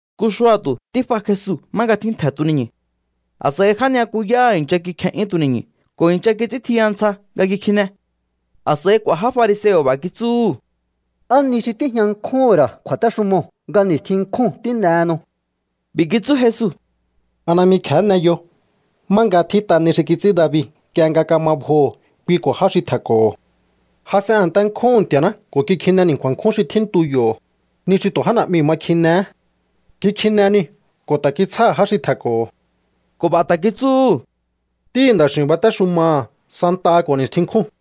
Nku xua̱tu̱ tíf'a Jesu má nga tjíntje̱ tuni̱ñu̱. A̱s'a̱i já ni'yakuyáha̱ i̱ncha kikje'yún tuni̱ñu̱ ko̱ i̱ncha kits'íntjiya ntsja nga kikjine. A̱s'a̱i k'u̱a̱ já fariseo̱ b'a̱ kitsúhu̱: —¿Á ni xi tíjña nkjúhu̱n ra̱ kju̱a̱téxumoo̱ nga ni̱stjin nkjúu̱n tín'ehenu? B'i̱ kitsú Jesu: —¿A najmi kje̱hé n'eyo má nga tjít'a ni xi kits'ín David nk'ie nga kama bjoho̱ kui ko̱ já xi tje̱nko̱ho̱? Jas'en a̱nte nkjúhu̱n Nti̱a̱ná ko̱ kikjine ni̱nku̱a̱n nkjún xi tjíntu yo̱, ni xi tu̱ já na̱'miu̱ ma kjinehé. Kikjine niu̱ ko̱ ta̱ kitsjáha̱ já xi tje̱nko̱ho̱. Ko̱ b'a̱ ta̱ kitsúhu̱: —Ntíhi̱ Nda̱x'i̱u̱n batéxumaha̱ santaha ko̱ ni̱stjin nkjúu̱n.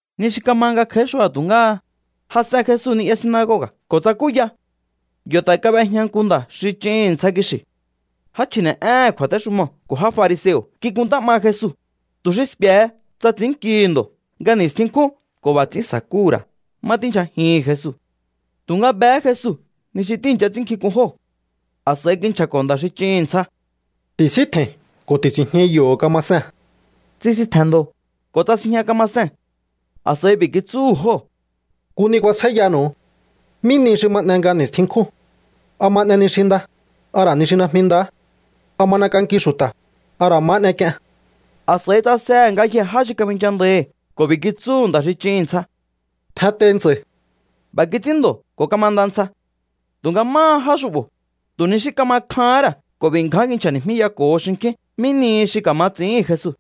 Ni xi kama nga kj'a̱í xua̱tu̱ ngáha, jas'en Jesu ni'ya sinagoga̱ ko̱ tsakúya. Yo̱ ta̱ kab'ejña nku nda̱ xi ch'ihi̱n ntsja kixi̱. Já chji̱ne̱'éhe̱n kju̱a̱téxumoo̱ ko̱ já fariseo̱ kikuntá 'ma Jesu, tu̱ xi sku̱e̱he tsa ts'i̱ínnkihi̱ ndo̱ nga ni̱stjin nkjúu̱n ko̱ b'a̱ ts'ín sa̱kúhu̱ ra̱ má tíndyjajihi̱n Jesu. Tu̱nga behé Jesu ni xi tíi̱ncha ts'ínnkjink'un jóo̱. A̱s'a̱i kinchja̱ko̱ nda̱ xi ch'ihi̱n ntsja: —Ti̱síntje̱i̱n ko̱ ti̱si̱njñai yo̱ kamasee̱n. Tsisintje̱n ndo̱ ko̱ tsasinjña kamasee̱n. A̱s'a̱i b'i̱ kitsúhu̱ jóo̱: —Nku ni kuasjáíyanu̱u. ¿Mí nihi xi ma n'e nga ni̱stjin nkjúu̱n? ¿A ma n'e ni xi nda, a ra̱ ni xi najmi nda? ¿A ma n'ek'anki xu̱ta̱, a ra̱ ma n'ek'ien? A̱s'a̱i tsasehe̱ ngayjee̱ já xi kabinchandáíhi̱ ko̱ b'i̱ kitsúhu̱ nda̱ xi ch'ihi̱n ntsja: —Tjentei ntsa̱i̱. B'a̱ kits'ín ndo̱ ko̱ kamanda ntsja. Tu̱nga máha já xu'bo̱, tu̱ ni xí kama kjahán ra̱ ko̱ b'i̱ ngján kinchja̱ni̱jmíyako̱ho xinkjín mí nihi xi ka̱ma ts'i̱íhi̱n Jesu.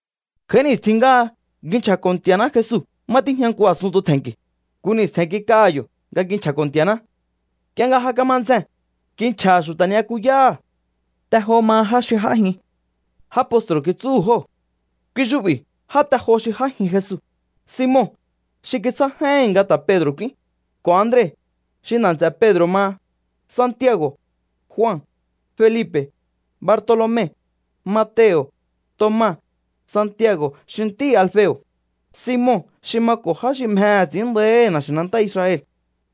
Kj'a̱í ni̱stjin ngáha ngji nchja̱ko̱ Nti̱a̱ná Jesu má tíjña nku a̱sunntu tje̱nki̱. Nku ni̱stje̱n kik'aha̱ yo̱ nga kinchja̱ko̱ Nti̱a̱ná. Nk'ie nga ja kama ndzjee̱n, kinchja̱ha̱ xu̱ta̱ ni'yakuyáha̱. Te jo maha já xi j'ájin. Já postru̱ kitsúhu̱ jóo̱. Kui xu'bi já te jo xi j'ájin Jesu: Simon, xi kitsjá j'áíhi̱n nga ta̱ Pedro̱ k'úín, ko̱ Andre, xi nda̱ nts'e̱ Pedro̱ maha, Santiago̱, Jua, Felipe̱, Bartolome, Mateo̱, Toma, Santiago̱ xi ntíhi̱ Alfeo̱, Simon xi mako̱ já xi mjehe̱ ts'i̱ín nda̱íhi̱ na̱xi̱nantá Israel,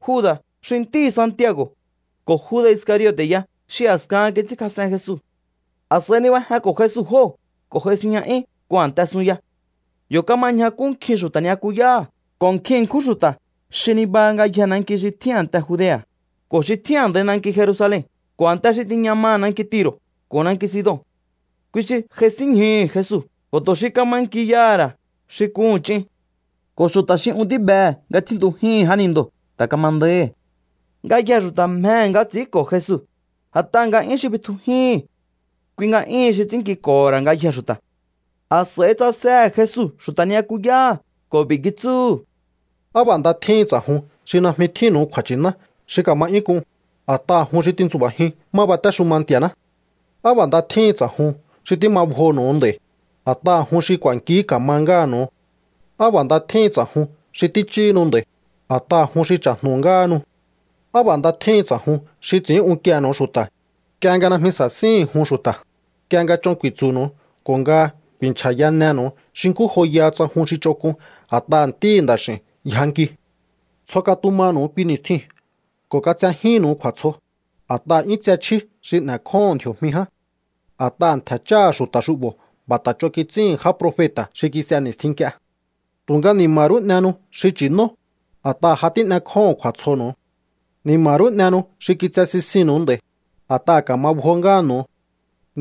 Juda̱ xi ntíhi̱ Santiago̱, ko̱ Juda̱ Iscariote̱ ya xi a̱skahan kits'ínkjas'en Jesu. A̱s'a̱i nibajenko̱ Jesu jóo̱ ko̱ j'ai sinjña'yún nku a̱nte sunya. Yo̱ kama ñjakú nkjin xu̱ta̱ ni'yakuyáha̱ ko̱ nkjin ṉkjún xu̱ta̱ xi nibaha ngayjee̱ nanki xi tjín a̱nte Judea̱ ko̱ xi tjín a̱ndaihi̱ nanki Jerusalen ko̱ a̱nte xi tiña maha̱ nanki Tiro̱ ko̱ nanki Sidon. Kui xi j'aisínñjuhu̱ Jesu ko̱ tu̱ xi ka̱ma nki yaha̱ ra̱ xi k'uhu̱n ch'in. Ko̱ xu̱ta̱ xi un tíbehe̱ nga tjíntujíhi̱n jánindoo̱ ta̱ kama nda̱íhi̱. Ngayjee̱ xu̱ta̱ mjehe̱ nga ts'i̱ínko̱ Jesu, a̱t'aha̱ nga'yún xi bitjujíhi̱n. Kui nga'yún xi ts'ínnkiko̱ho̱ ra̱ ngayjee̱ xu̱ta̱. A̱s'a̱i tsasehe̱ Jesu xu̱ta̱ ni'yakuyáha̱ ko̱ b'i̱ kitsúhu̱: —Á b'a̱ nda tjíhin ts'a̱jun xi najmi tjínnu̱u kju̱a̱nchíná xi ka̱ma 'yún k'un, a̱t'aha̱ jun xi tintsu̱ba̱jiun má batéxuma Nti̱a̱ná. ’Á b'a̱ nda tjíhin ts'a̱jun xi tíma bjoho̱nu̱u nd'a̱i̱, a̱t'aha̱ jun xi k'u̱a̱nki ka̱ma ngáha̱nu̱u. ’Á b'a̱ nda tjíhin ts'a̱jun xi tích'íhinu nd'a̱i̱, a̱t'aha̱ jun xi cha̱jnu̱ ngáhanu. ’Á b'a̱ nda tjíhin ts'a̱jun xi ts'i̱ín unkiehe̱nu̱u xu̱ta̱, nk'ie nga najmi sa̱síhi̱n jun xu̱ta̱, nk'ie nga ch'on ku̱i̱tsu̱nu̱u ko̱ nga ku̱i̱nchja̱yanenu̱u xi nkú joyaha tsa jun xi ch'onk'un a̱t'aha̱ Ntíhi̱ Nda̱x'i̱u̱n yjankiu. Tsjo katumanu̱u kui ni̱stjiu̱n ko̱ katsejíhi̱nnu̱u kju̱a̱tsjo, a̱t'aha̱ 'yún tse chjí xi n'e̱kjóho̱on ndji̱o̱jmi ján. A̱t'aha̱ ntje̱ cháha̱ xu̱ta̱ xu'bo̱ b'a̱ ta̱ ch'on kits'íhi̱n já profeta̱ xi kis'e ni̱stjin nk'ie. ’Tu̱nga ni̱ma̱ rú n'ehenu xi nchi̱nó, a̱t'aha̱ ja tín'ekjóho̱on kju̱a̱tsjonu̱u. ’Ni̱ma̱ rú n'ehenu xi kitse sisinnu̱u nd'a̱i̱, a̱t'aha̱ ka̱ma bjo ngáha̱nu̱u.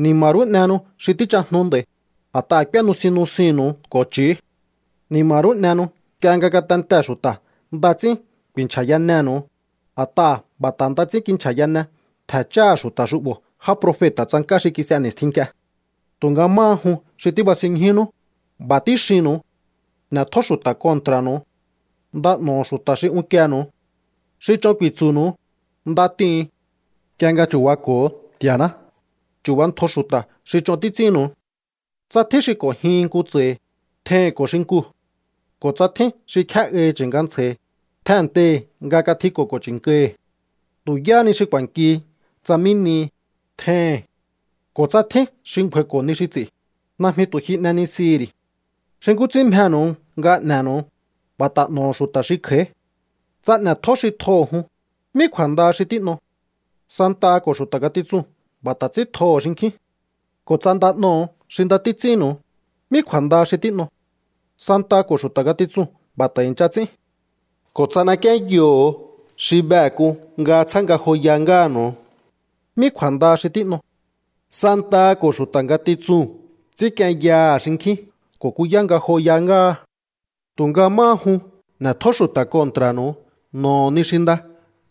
’Ni̱ma̱ rú n'ehenu xi tíchajnu nd'a̱i̱, a̱t'aha̱ k'úé nusin nusinnu̱u ko̱ ch'i̱ú. ’Ni̱ma̱ rú n'ehenu nk'ie nga ngatentee̱ xu̱ta̱ nda ts'ín ku̱i̱nchja̱yanenu̱u, a̱t'aha̱ b'a̱ ta̱ nda ts'ín kinchja̱yane ntje̱ cháha̱ xu̱ta̱ xu'bo̱ já profeta̱ tsank'á xi kis'e ni̱stjin nk'ie. ’Tu̱nga máha jun xi tíbasinñjúnú, b'a̱ tíxinnu̱u. N'e̱tjó xu̱ta̱ kontra̱nu̱u. Nda n'o̱ho̱ xu̱ta̱ xi unkienu̱u. Xi ch'on ku̱i̱tsu̱nu̱u, nda t'ihu̱un. Nk'ie nga chu̱bako̱o Nti̱a̱ná, chu̱bantjo xu̱ta̱ xi ch'on títs'ínnu̱u. Tsa tjín xi k'o̱njihin nku tsa̱hi̱, tjeihi̱n ko̱ xinkuu̱. Ko̱ tsa tjín xi kjé'ahi chi̱nkantsja̱hi̱, tjennteihi̱ nga katjiko̱ ko̱ chi̱nkahi̱. Tu̱ yáhá ni xi ku̱a̱nkihi tsa mí nihi, tjeihi̱n. Ko̱ tsa tjín xi ngju̱a̱i̱ko̱ ni xi ts'i̱, najmi tu̱ ji n'enisihi̱ ri̱. Xi nkú ts'ín mjenu̱u nga n'e̱nu̱u, b'a̱ ta̱ n'o̱ho̱ xu̱ta̱ xi kj'a̱í. ’Tsa n'e̱tjó xi tjoho̱ jun, ¿mí kju̱a̱ndaha xi tín'o? Santaha ko̱ xu̱ta̱ ngatitsuu̱n b'a̱ ta̱ ts'ín tjoho̱ xinkjín. Ko̱ tsa nda n'oho̱o xi nda títs'ínnu̱u, ¿mí kju̱a̱ndaha xi tín'o? Santaha ko̱ xu̱ta̱ ngatitsuu̱n b'a̱ ta̱ i̱ncha ts'ín. Ko̱ tsa n'ekienyoho̱o xi behe̱ k'un nga tsjá ngajoya ngáha̱nu̱u, ¿mí kju̱a̱ndaha xi tín'o? Santaha ko̱ xu̱ta̱ ngatitsuu̱n ts'ínkienyaha̱ xinkjín ko̱ kuyá ngajoya ngáha. ’Tu̱nga máha jun, n'e̱tjó xu̱ta̱ kontra̱nu̱u, n'o̱ho̱ ni xi nda,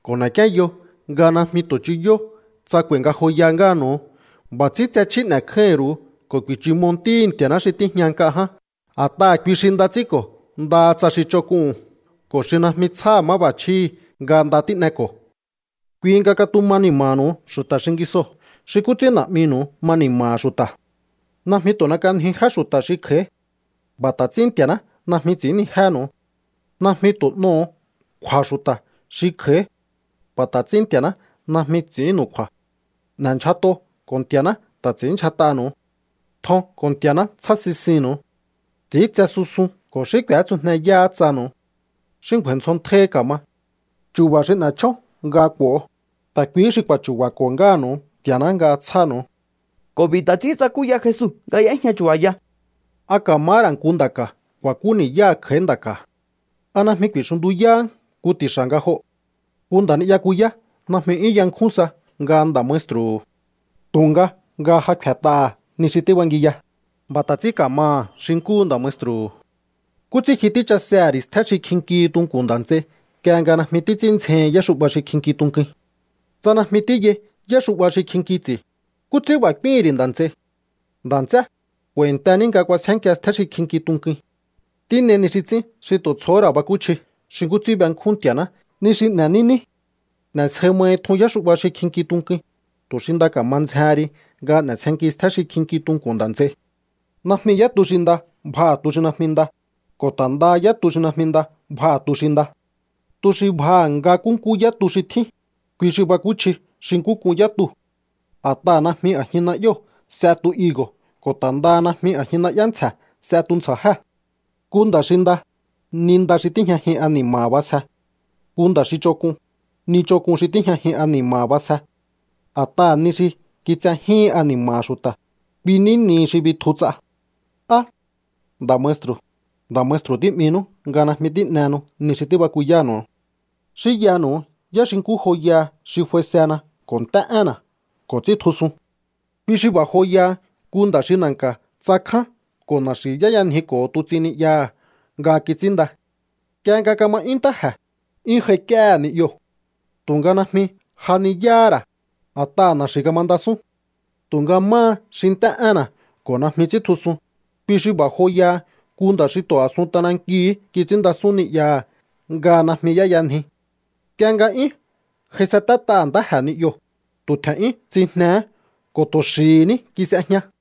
ko̱ n'e̱kienyo nga najmi tu̱ chuyó tsa k'u̱a̱i̱ ngajoya ngáha̱nu̱u. B'a̱ ts'ín tse chjí n'e̱kjáíhi̱n ru̱u ko̱ ku̱i̱chúmo ntíhi̱ Nti̱a̱ná xi tíjña nk'a ján. A̱t'aha̱ kui xi nda ts'ínko̱ ndaha tsa xi ch'onk'uu̱n ko̱ xi najmi tsjáha̱ máb'a̱chjíhi̱ nga nda tín'eko̱. Kui nga katuma ni̱ma̱ha̱nu̱u xu̱ta̱ xingisoo̱ xi nkú ts'ín Na̱'minu̱u ma ni̱ma̱ha̱ xu̱ta̱. ’Najmi tu̱ n'ek'anjiu jé xu̱ta̱ xi kj'a̱í. B'a̱ ta̱ ts'ín Nti̱a̱ná najmi ts'i̱ínnijénu̱u. Najmi tu̱ n'oho̱o kju̱a̱ xu̱ta̱ xi kj'a̱í. B'a̱ ta̱ ts'ín Nti̱a̱ná najmi ts'i̱ínnu̱u kju̱a̱. N'e̱ndyjat'o ko̱ Nti̱a̱ná ta̱ ts'i̱ínndyjat'anu̱u. Tjon ko̱ Nti̱a̱ná tsjá sisinnu̱u. Ts'i̱íntse susun ko̱ xí k'u̱étsujneyáhá tsanu̱u. Xí ngju̱a̱i̱ ndzjontjáíhí ka̱ma. Chu̱ba̱ xi n'e̱ chjón nga k'u̱o, ta̱ kui xi k'u̱a̱chu̱ba̱ko̱ ngáha̱nu̱u Nti̱a̱ná nga tsjánu̱u. Ko̱ b'i̱ ta̱ ts'ín tsakúya Jesu nga y'éjña chu̱ba̱ya: —¿A ka̱mahá ra̱ nku nda̱ ka̱ ku̱a̱kú ni̱yáha̱ kj'a̱í nda̱ ka̱? ¿A najmi ku̱i̱xuntuyáhá nku ti̱xa̱ nga joo̱? Nku nda̱ ni'yakuyá najmi 'yún yankjún sa nga nda̱ maestru̱hu̱. Tu̱nga nga ja kfe̱t'aha̱ ni xi tíbangiya, b'a̱ ta̱ ts'ín ka̱maha̱ xi nkúhu nda̱ maestru̱hu̱. ’¿Nkú ts'ín ji tíchasehe̱ ri̱ stjé xi kjinkihi tunku̱n nda̱ nts'ei nk'ie nga najmi títs'ín ndzjehin yáxu'ba xi kjinki tunkuin? Tsa najmi tíyai yáxu'ba xi kjinki ts'i̱, ¿nkú ts'ín b'a̱ k'úíhi̱n ri̱ nda̱ nts'ei: “Nda̱ nts'é, k'u̱a̱i̱ntení nga k'uasjénkia stjé xi kjinki tunkuin”? Tín'ei ni xi ts'ín xi tu̱ tsjohó ra̱ bakúchji xi nkú ts'ín benkjún Nti̱a̱ná ni xi n'e̱ní ní. N'e̱sje mahi tjun yáxu'ba xi kjinki tunkuin, tu̱ xi nda ka̱ma ndzjehen ri nga n'e̱sjenki stjé xi kjinki tunku̱n nda̱ nts'ei. ’Najmi yá tu xi nda bjaha̱ tu xi najmi nda, ko̱ ta̱ ndaha yá tu xi najmi nda bjaha̱ tu xi nda. Tu xi bjaha̱ nga nkúnkú yá tu xi tjín, kui xi bakúchji xi nkú k'un yá tuu̱. A̱t'aha̱ najmi a̱jin na'yóo̱ s'e tu higo̱ ko̱ ta̱ ndaha najmi a̱jin na'yá ntsje̱ s'e tuntsja̱jé. Nku nda̱ xi nda, ni nda xi tíjñajin ani̱ma̱ha̱ b'asje. Nku nda̱ xi ch'onk'un, ni ch'onk'un xi tíjñajin ani̱ma̱ha̱ b'asje. A̱t'aha̱ ni xi kitsejíhin ani̱ma̱ha̱ xu̱ta̱, kui ní nihi xi bitju ts'a. ’¿Á: “Nda̱ maestru̱, nda̱ maestru̱”, tí'mihinú nga najmi tín'ehenu ni xi tíbakuyánu̱u? Xínyanu̱u yá xi nkú joyaha xi f'aisena ko̱ nt'é énna̱ ko̱ ts'íntjusun. Kui xi b'a̱ joyaha nku nda̱ xi na̱nka̱ tsakján ko̱ na̱xi̱ y'éyanjiko̱ho tuts'in ni'yaha̱ nga kits'ínnda. Nk'ie nga kama 'yún ntáje̱, 'yún j'aik'íéhe̱ ni'yoo̱. Tu̱nga najmi j'ajniyáhá ra̱, a̱t'aha̱ na̱xi̱ kamandasún. ’Tunga máha xi nt'é énna̱ ko̱ najmi ts'íntjusun, kui xi b'a̱ joyaha nku nda̱ xi tu̱ a̱sun t'anankiu̱hú kits'ínndasún ni'yaha̱ nga najmi y'éyanji. Nk'ie nga 'yún j'aisatéhe̱ ntáje̱ ni'yoo̱, tu̱ tje̱n'yún tsijnehé ko̱ tu̱ xi̱hi̱ ní kis'ejña.